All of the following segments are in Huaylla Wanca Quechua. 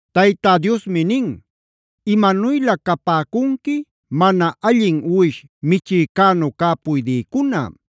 Tayta Diosmi nin: “Imanuylä capäcunqui mana allin uwish michïcänu cä puydïcuna.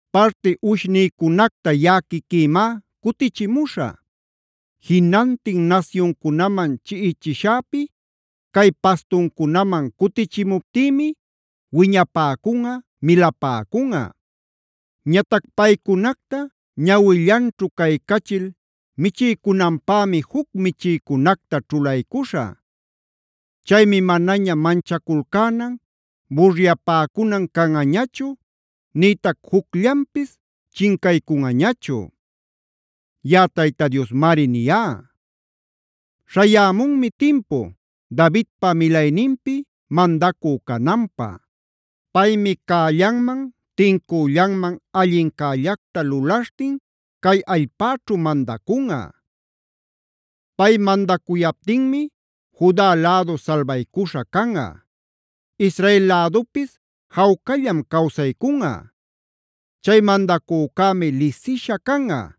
Parti uwishnïcunacta yaꞌa quiquïmá cutichimuśhä. Jinantin nasyuncunaman chiꞌichishäpi cay pastuncunaman cutichimuptïmi wiñapäcunꞌa, milapäcunꞌa. Ñatac paycunacta ñawillanćhu caycachil michiycunanpämi juc michïcunacta ćhulaycuśhä. Chaymi manaña manchaculcänan, buryapäcunan canꞌañachu, nïtac jucllanpis chincaycunꞌañachu.b Yaꞌa Tayta Diosmari niyá. “Śhayämunmi timpu Davidpa milayninpi mandacü cananpä. Paymi cällanman, tincüllanman allincällacta lulaśhtin cay allpäćhu mandacunꞌa. Pay mandacuyaptinmi Juda lädu salbaycuśha canꞌa; Israel lädupis jawcallam cawsaycunꞌa. Chay mandacücämi lisisha canꞌa: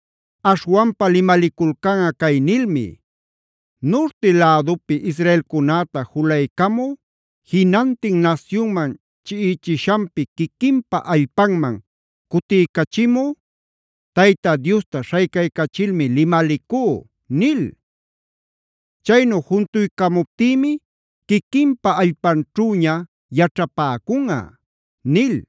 Aśhwanpa limaliculcanꞌa cay nilmi: ‘Nurti lädupi israelcunäta julaycamü, jinantin nasyunman chiꞌichishanpi quiquinpa allpanman cutiycachimü Tayta Diosta śhaycaycachilmi limalicú’ nil.d Chaynu juntuycamuptïmi quiquinpa allpanćhüña yaćhapäcunꞌa” nil.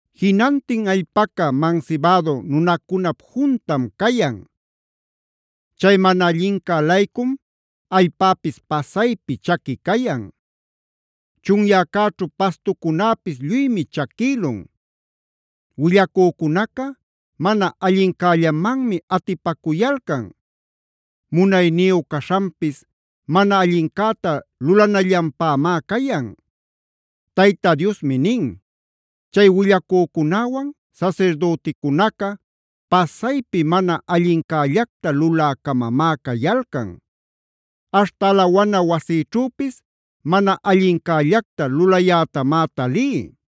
Jinantin allpaca mansibädu nunacunap juntam cayan. Chay mana allincä-laycum allpäpis pasaypi chaqui cayan. Chunyäcäćhu pastucunäpis lluymi chaquïlun. Willacücunaca mana allincällamanmi atipacuyalcan; munayniyu caśhanpis mana allincäta lulanallanpämá cayan. Tayta Diosmi nin: “Chay willacücunäwan sasirdüticunaca pasaypi mana allincällacta lulä-camamá cayalcan. Aśhta alawana wasïćhüpis mana allincällacta lulayätamá talí.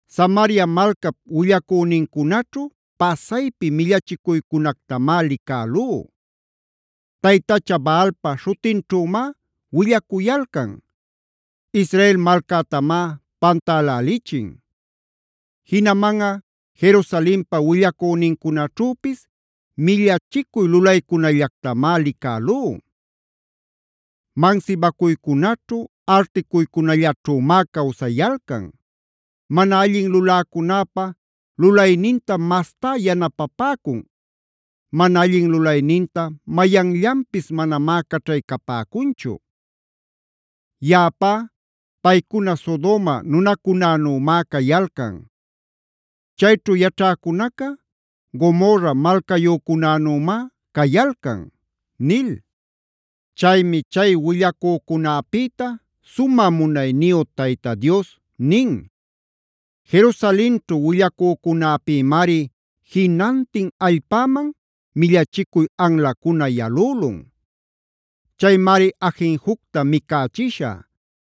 “Samaria malcap willacünincunaćhu pasaypi millachicuycunactamá licälú: Taytacha Baalpa śhutinćhümá willacuyalcan; Israel malcätamá pantälälichin. Jinamanꞌa Jerusalenpa willacünincunaćhüpis millachicuy lulaycunallactamá licälú; mansibacuycunaćhu, articuycunallaćhümá cawsayalcan. Mana allin luläcunäpa lulaynintam mastá yanapapäcun. Mana allin lulayninta mayanllanpis manamá caćhaycapäcunchu. Yaꞌapá paycuna Sodoma nunacunänümá cayalcan; chayćhu yaćhäcunaca Gomorraf malcayücunänümá cayalcan” nil. Chaymi chay willacücunäpïta sumä munayniyu Tayta Dios nin: “Jerusalenćhu willacücunäpïmari jinantin allpäman millachicuy anlacuna yalülun. Chaymari ajinjucta micächishä;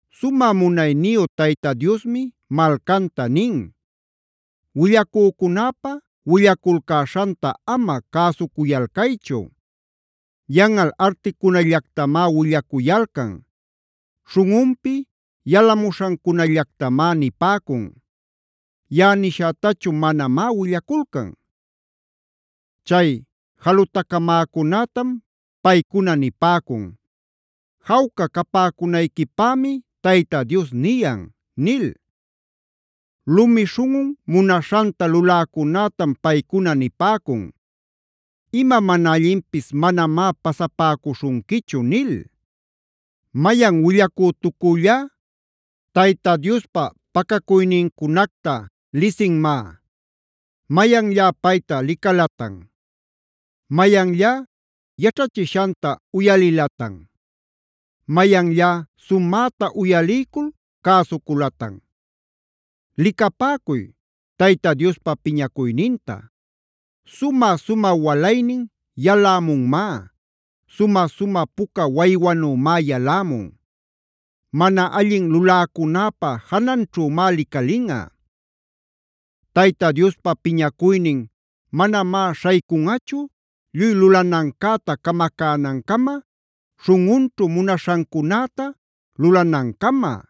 Sumä munayniyu Tayta Diosmi malcanta nin: “Willacücunäpa willaculcäśhanta ama cäsucuyalcaychu. Yanꞌal articunallactamá willacuyalcan. Śhunꞌunpi yalamuśhancunallactamá nipäcun. Yaꞌa nishätachu manamá willaculcan. Chay jalutacamäcunätam paycuna nipäcun: ‘Jawca capäcunayquipämi Tayta Dios niyan’ nil. Lumi śhunꞌun munaśhanta luläcunätam paycuna nipäcun: ‘Ima mana allinpis manamá pasapäcuśhunquichu’ nil. “¿Mayan willacütucüllá Tayta Diospa pacacuynincunacta lisinmá? ¿Mayanllá payta licalatan? ¿Mayanllá yaćhachishanta uyalilatan? ¿Mayanllá sumäta uyaliycul cäsuculatan? ¡Licapäcuy! Tayta Diospa piñacuyninta; sumä-sumä walaynin yalämunmá; sumä-sumä puca waywanümá yalämun. Mana allin luläcunäpa jananćhümá licalinꞌa. Tayta Diospa piñacuynin manamá śhaycunꞌachu lluy lulanancäta camacänancama, śhunꞌunćhu munaśhancunäta lulanancama.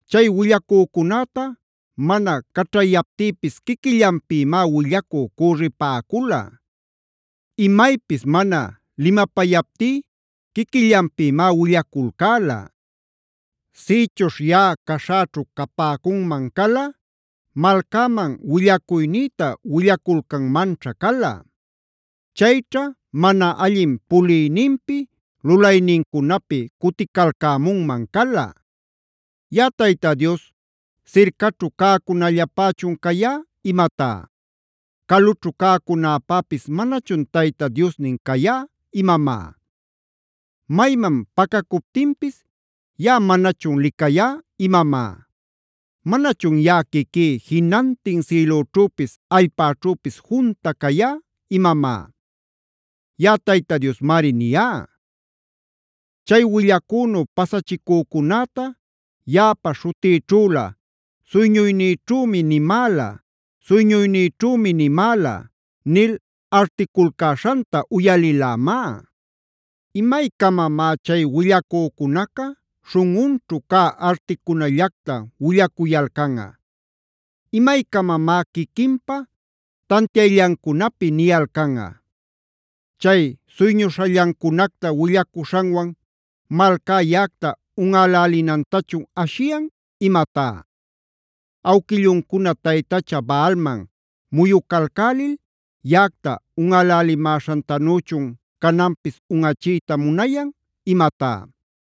“Chay willacücunäta mana caćhayaptïpis quiquillanpïmá willacü cürripäcula. Imaypis mana limapayaptí quiquillanpïmá willaculcäla. Sïchuśh yaꞌa caśhäćhu capäcunman cala, malcäman willacuynïta willaculcanmanćha cala. Chayćha mana allin puliyninpi, lulaynincunapi cuticalcämunman cala. “Yaꞌa Tayta Dios ¿sircaćhu cäcunällapächun cayá imatá? ¿Calućhu cäcunäpäpis manachun Tayta Diosnin cayá imamá? Mayman pacacuptinpis ¿yaꞌa manachun licayá imamá? ¿Manachun yaꞌa quiquí jinantin sïlüćhüpis allpäćhüpis junta cayá imamá?i Yaꞌa Tayta Diosmari niyá. “Chay willacünu pasachicücunäta yaꞌapa śhutïćhülä: ‘Suyñuynïćhümi nimäla; suyñuynïćhümi nimäla’ nil articulcäśhanta uyalïlämá. ¿Imaycamamá chay willacücunaca śhunꞌunćhu cä articunallacta willacuyalcanꞌa? ¿Imaycamamá quiquinpa tantiayllancunapi niyalcanꞌa? Chay suyñuśhallancunacta willacuśhanwan ¿malcá yaꞌacta unꞌälälinantachun ashiyan imatá? ¿Awquilluncuna taytacha Baalman muyucalcälil yaꞌacta unꞌälälimäśhantanüchun cananpis unꞌachiyta munayan imatá?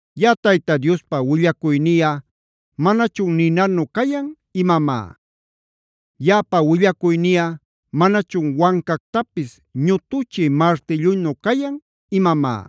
¿Yaꞌa Tayta Diospa willacuyniꞌa manachun ninanu cayan imamá? ¿Yaꞌapa willacuyniꞌa manachun wancactapis ñutuchï martillunu cayan imamá?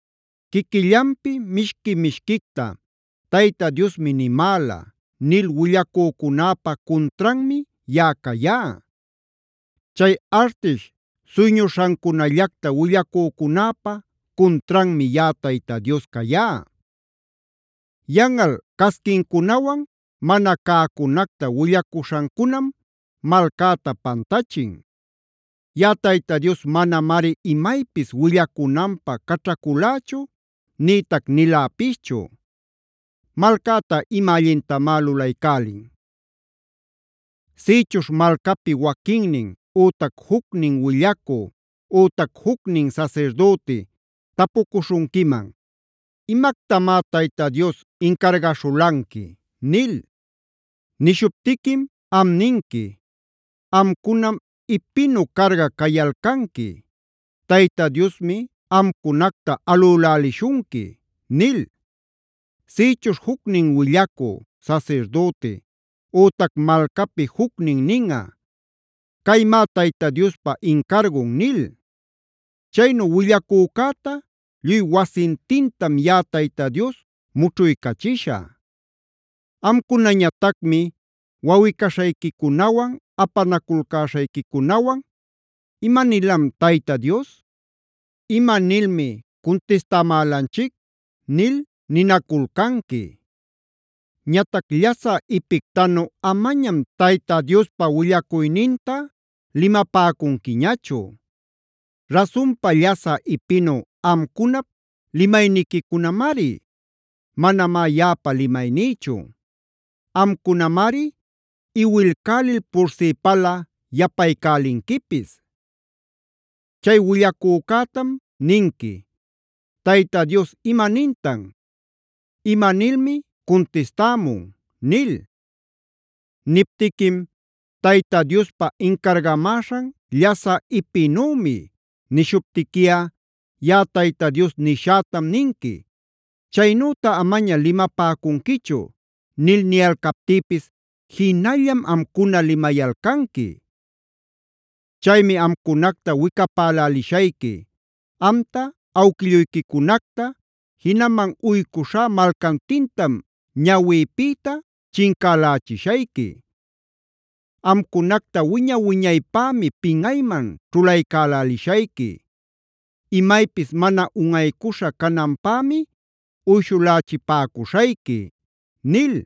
Quiquillanpi mishqui-mishquicta ‘Tayta Diosmi nimäla’ nil willacücunäpa cuntranmi yaꞌa cayá. Chay artish suyñuśhancunallacta willacücunäpa cuntranmi yaꞌa Tayta Dios cayá. Yanꞌal casquincunawan mana cäcunacta willacuśhancunam malcäta pantachin. Yaꞌa Tayta Dios manamari imaypis willacunanpä caćhaculächu nïtac niläpischu. ¿Malcäta ima allintamá lulaycälin? “Sïchuśh malcapi waquinnin ütac jucnin willacü ütac jucnin sasirdüti tapucuśhunquiman: ‘¿Imactamá Tayta Dios incargaśhulanqui?’ nil. Nishuptiquim am ninqui: ‘Amcunam ipinü carga cayalcanqui. Tayta Diosmi amcunacta alülälishunqui’ nil. Sïchuśh jucnin willacü, sasirdüti ütac malcapi jucnin ninꞌa: ‘Caymá Tayta Diospa incargun’ nil. Chaynu willacücäta lluy wasintintam yaꞌa Tayta Dios mućhuycachishä. Amcunañatacmi wawꞌi-caśhayquicunawan, apanaculcäśhayquicunawan: ‘¿Imanilam Tayta Dios? ¿Imanilmi cuntistamälanchic?’ nil ninaculcanqui. Ñatac llasä ipictanü amañam Tayta Diospa willacuyninta limapäcunquiñachu; rasunpa llasä ipinü amcunap limayniquicunamari; manamá yaꞌapa limaynïchu; amcunamari iwilcälil pursipäla yapaycälinquipis. “Chay willacücätam ninqui: ‘¿Tayta Dios ima nintan? ¿Ima nilmi cuntistämun?’ nil. Niptiquim: ‘Tayta Diospa incargamäśhan llasä ipinümi’ nishuptiquiꞌa yaꞌa Tayta Dios nishätam ninqui: ‘Chaynüta amaña limapäcunquichu’ nil niyalcaptïpis jinallam amcuna limayalcanqui. Chaymi amcunacta wicapälälishayqui. Amta, awquilluyquicunacta, jinaman uycuśhá malcantintam ñawïpïta chincälächishayqui. Amcunacta wiña-wiñaypämi pinꞌayman ćhulaycälishayqui; imaypis mana unꞌaycuśha cananpämi uyshulächipäcuśhayqui” nil.